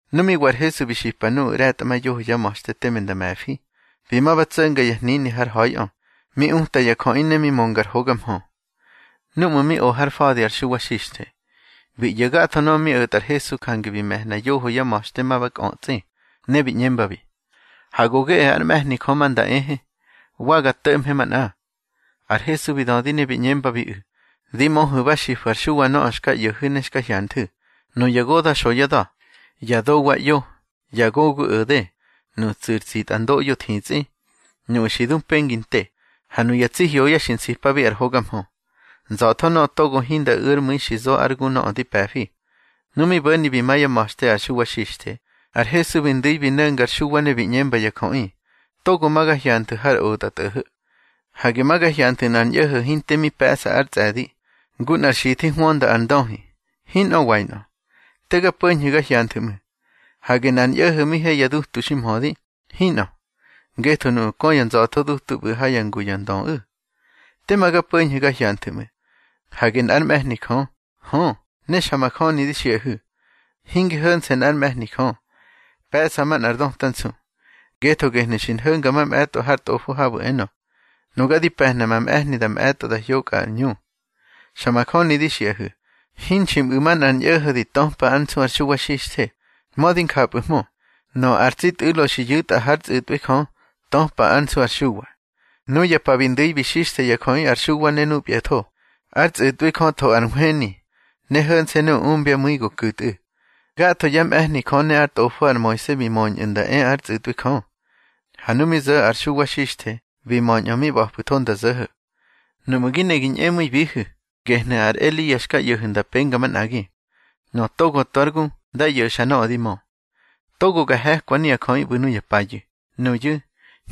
Nu mi wa ar Hesu bi xipa nuꞌu̱ ꞌre̱tꞌamayoho yá ma̱xte teme nda me̱fi, bi ma ba tso̱nga ya hnini har ha̱iꞌö, mi uta ya jöꞌi ne mi mönga ar hoga mhö. Núꞌmu̱ mi o har fa̱di ar Xuwa Xixthe, bi ꞌyo̱ gatho nöꞌö mi o̱tꞌa ar Hesu, jange bi me̱hna yoho yá ma̱xte ma ba kꞌötsꞌi, ne bi ꞌñembabi: —Ha go geꞌe ár mꞌe̱hni Jö ma nda ehe, wa ga to̱ꞌmhe manꞌa. Ar Hesu bi dödi ne bi ꞌñembabiꞌu̱: —Di möhu̱ ba xifu̱ ar Xuwa nöꞌö xka ꞌyo̱hu̱ ne xka hyanthu̱. Nuya goda̱ xo yá da̱, ya dowa ꞌyo, ya gogu o̱de, nuꞌu̱ tsu̱ ar tsitꞌandoꞌyo thitsꞌi, nuꞌu̱ xi du pengi nte, ha nuya tsi hyoya xi nsipabi ar hoga mhö. Nza̱tho nöꞌö togo hinda u̱ ár mu̱i xi zo ár gu nöꞌö di pe̱fi. Nu mi bo̱ni bi ma yá ma̱xte ar Xuwa Xixthe, ar Hesu bi ndu̱i bi no̱nga ar Xuwa ne bi ꞌñemba ya jöꞌi: —Togo ma ga hyanthu̱ har otꞌatꞌo̱ho̱. Hage ma ga hyanthu̱ nꞌar ñꞌo̱ho̱ hinte mi pe̱ꞌsa ár tsꞌe̱di, ngu nꞌar xithi hwönda ar ndöhi. Hinꞌö wainꞌö. Te ga po̱ñhu̱ ga hyanthu̱ ꞌmu̱. Hage nꞌar ñꞌo̱ho̱ mi he ya dutu ximhödi. Hinꞌö, ngetho nuꞌu̱ kö yá nza̱tho dutu ꞌbu̱ ha yá ngu ya ndöꞌu̱. Tema ga po̱ñhu̱ ma ga hyanthu̱ ꞌmu̱. Hage nꞌár mꞌe̱hni Jö. Hö, ne xa majöni di xiꞌahu̱, hinge ho̱nse̱ nꞌár mꞌe̱hni Jö, pe̱ꞌsa manꞌar döta nsu. Ngetho gehnu̱ xki nho̱nga mamꞌe̱tꞌo har Tꞌofo habu̱ enö: Nuga di pe̱hna ma mꞌe̱hni da mꞌe̱tꞌo da hyokꞌa ar ꞌñu. Xa majöni di xiꞌahu̱, hinxi mꞌu̱ manꞌar ñꞌo̱ho̱ di töpa ár nsu ar Xuwa Xixthe. Mödi njapꞌu̱hmö, nöꞌö ar tsi tꞌu̱lo xi yu̱tꞌa hár tsꞌu̱tꞌwi Jö, töpa ár nsu ar Xuwa. Nuya pa bi ndu̱i bi xixthe ya jöꞌi ar Xuwa ne nubyatho, ár tsꞌu̱tꞌwi Jö tho ar nhweni, ne ho̱nse̱ nuꞌu̱ umbyá mu̱i go ku̱tꞌu̱. Gatho yá mꞌe̱hni Jö ne ár tꞌofo ar Moise bi möñꞌu̱ nda e ár tsꞌu̱tꞌwi Jö, ha nu mi zo̱ ar Xuwa Xixthe bi möñꞌö mi ꞌba̱pꞌu̱tho nda zo̱ho̱. Nuꞌmu̱ gi ne gi ñꞌemu̱ibihu̱, gehnu̱ ar Elia xka ꞌyo̱hu̱ nda penga manꞌagi. Nöꞌö togo tu ár gu, dá ꞌyo̱xa nöꞌö di mö. Togo ga he̱kwabi nuya jöꞌi ꞌbu̱ nuya payu̱. Nuyu̱,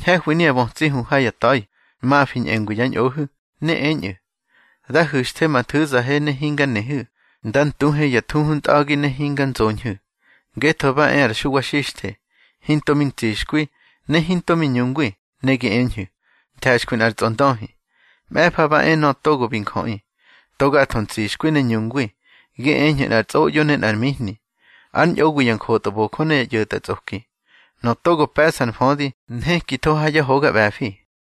ñhe̱hwi nuya bötsi hu ha ya ta̱i, mafi ñꞌengwi yá ñꞌohu̱. Ne eñꞌu̱: Da hu̱xthe ma nthu̱zahe ne hinga nehu̱, da ntuhe ya thuhu ntꞌa̱gi ne hinga nzoñhu̱. Ngetho ba e ar Xuwa Xixthe, hinto mi ntsixkwi, ne hinto mi ñungwi, ne gi eñhu̱: Nthe̱xkwi nꞌar tsꞌondöhi. Mꞌe̱fa ba e Nöꞌö Togo bi Njöꞌi, to gatho ntsixkwi ne ñungwi, gi eñhu̱ nꞌar tsꞌoꞌyo ne nꞌar mihni, ár ñꞌowi ya njotbojö ne ya ꞌyo̱tꞌatsꞌoki. Nöꞌö togo pe̱ꞌsa ar mfödi, nhekitho ha yá hoga ꞌbe̱fi.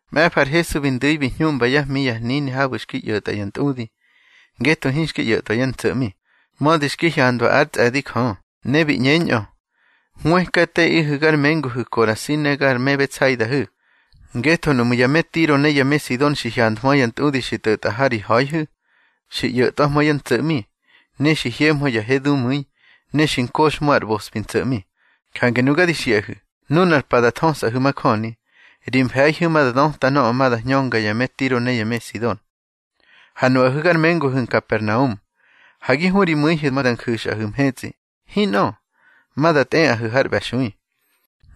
Mꞌe̱fa ar Hesu bi ndu̱i bi hñuꞌmba yá hmi ya hnini habu̱ xki ꞌyo̱tꞌa ya ntꞌudi, ngetho hinxki ꞌyo̱tꞌwa yá ntso̱ꞌmi, mödi xki hyandwa ár tsꞌe̱di Jö. Ne bi ꞌñeñꞌö: —Hwëkateꞌihu̱ gar menguhu̱ Korasi ne gar me Betsaidahu̱. Ngetho nuꞌmu̱ ya me Tiro ne ya me Sidon xi hyanthmö ya ntꞌudi xi tꞌo̱tꞌa ha ri ha̱ihu̱, xi ꞌyo̱tꞌwahmö yá ntso̱ꞌmi, ne xi hyemhö ya he dumu̱i, ne xi nkoxhmö ar ꞌbospi ntso̱ꞌmi. Jange nuga di xiꞌahu̱, nunar pa da thösꞌahu̱ majöni, ri mfe̱ihu̱ ma da döta nöꞌö ma da hñönga ya me Tiro ne ya me Sidon. Ha nuꞌahu̱ gar menguhu̱ Nkapernaum, ha gi hu ri mu̱ihu̱ ma da nju̱xꞌahu̱ mhetsꞌi. Hinꞌö, ma da tꞌeꞌahu̱ har ꞌbe̱xui.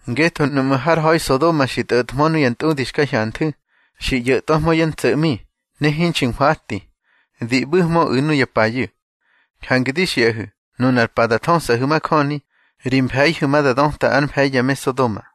Ngetho nuꞌmu̱ har ha̱i Sodoma xi tꞌo̱thmö nuya ntꞌudi xka hyanthu̱, xi ꞌyo̱tꞌwahmö yá ntso̱ꞌmi, ne hinxi nhwati, di ꞌbu̱hmöꞌu̱ nuya payu̱. Jange di xiꞌahu̱, nunar pa da thösꞌahu̱ majöni, ri mfe̱ihu̱ ma da döta ár mfe̱i ya me Sodoma.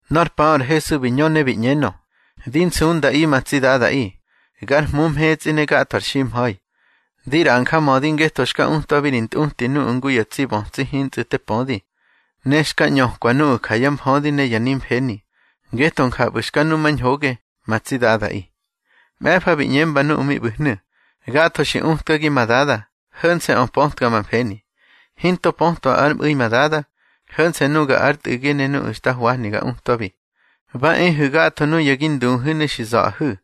Nor paꞌö ar Hesu bi ñö ne bi ꞌñenö: —Di nsundaꞌi, ma tsi Dadaꞌi, gar Hmu mhetsꞌi ne gatho ar ximha̱i. Di ꞌraꞌa njamödi ngetho xka utwabi ri ntꞌuti nuꞌu̱ ngu ya tsi bötsi hintsꞌu̱ te pödi, ne xka ꞌñökwa nuꞌu̱ ja yá mfödi ne ya nimfeni. Ngetho njapꞌu̱ xka numañhoge, ma tsi Dadaꞌi. Mꞌe̱fa bi ꞌñemba nuꞌu̱ mi ꞌbu̱hnu̱: —Gatho xi utkagi ma Dada. Ho̱nse̱ꞌö pötka ma mfeni. Hinto pötwa ár mꞌu̱i ma Dada, ho̱nse̱ nuga ár Tꞌu̱gi ne nuꞌu̱ xta hwahni ga utwabi. Ba ehu̱ gatho nuya gi nduhu̱ ne xi za̱ꞌahu̱,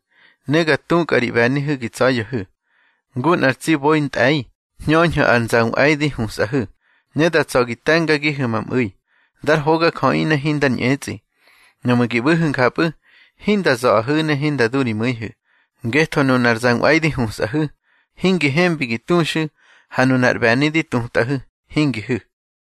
ne ga tukꞌa ri ꞌbe̱nihu̱ gi tsa̱ya̱hu̱. Ngu nꞌar tsi boi ntꞌe̱i, hñöñhu̱ ar zanꞌwe̱i di husꞌahu̱, ne da tsa̱ gi te̱ngagihu̱ ma mꞌu̱i, dar hogajöꞌi ne hindar ñꞌetsꞌi. Nuꞌmu̱ gi ꞌbu̱hu̱ njapꞌu̱, hinda za̱ꞌahu̱ ne hinda du ri mu̱ihu̱. Ngetho nunar zanꞌwe̱i di husꞌahu̱, hingi hembi gi tuxu̱, ha nunar ꞌbe̱ni di tutꞌahu̱, hingi hu̱.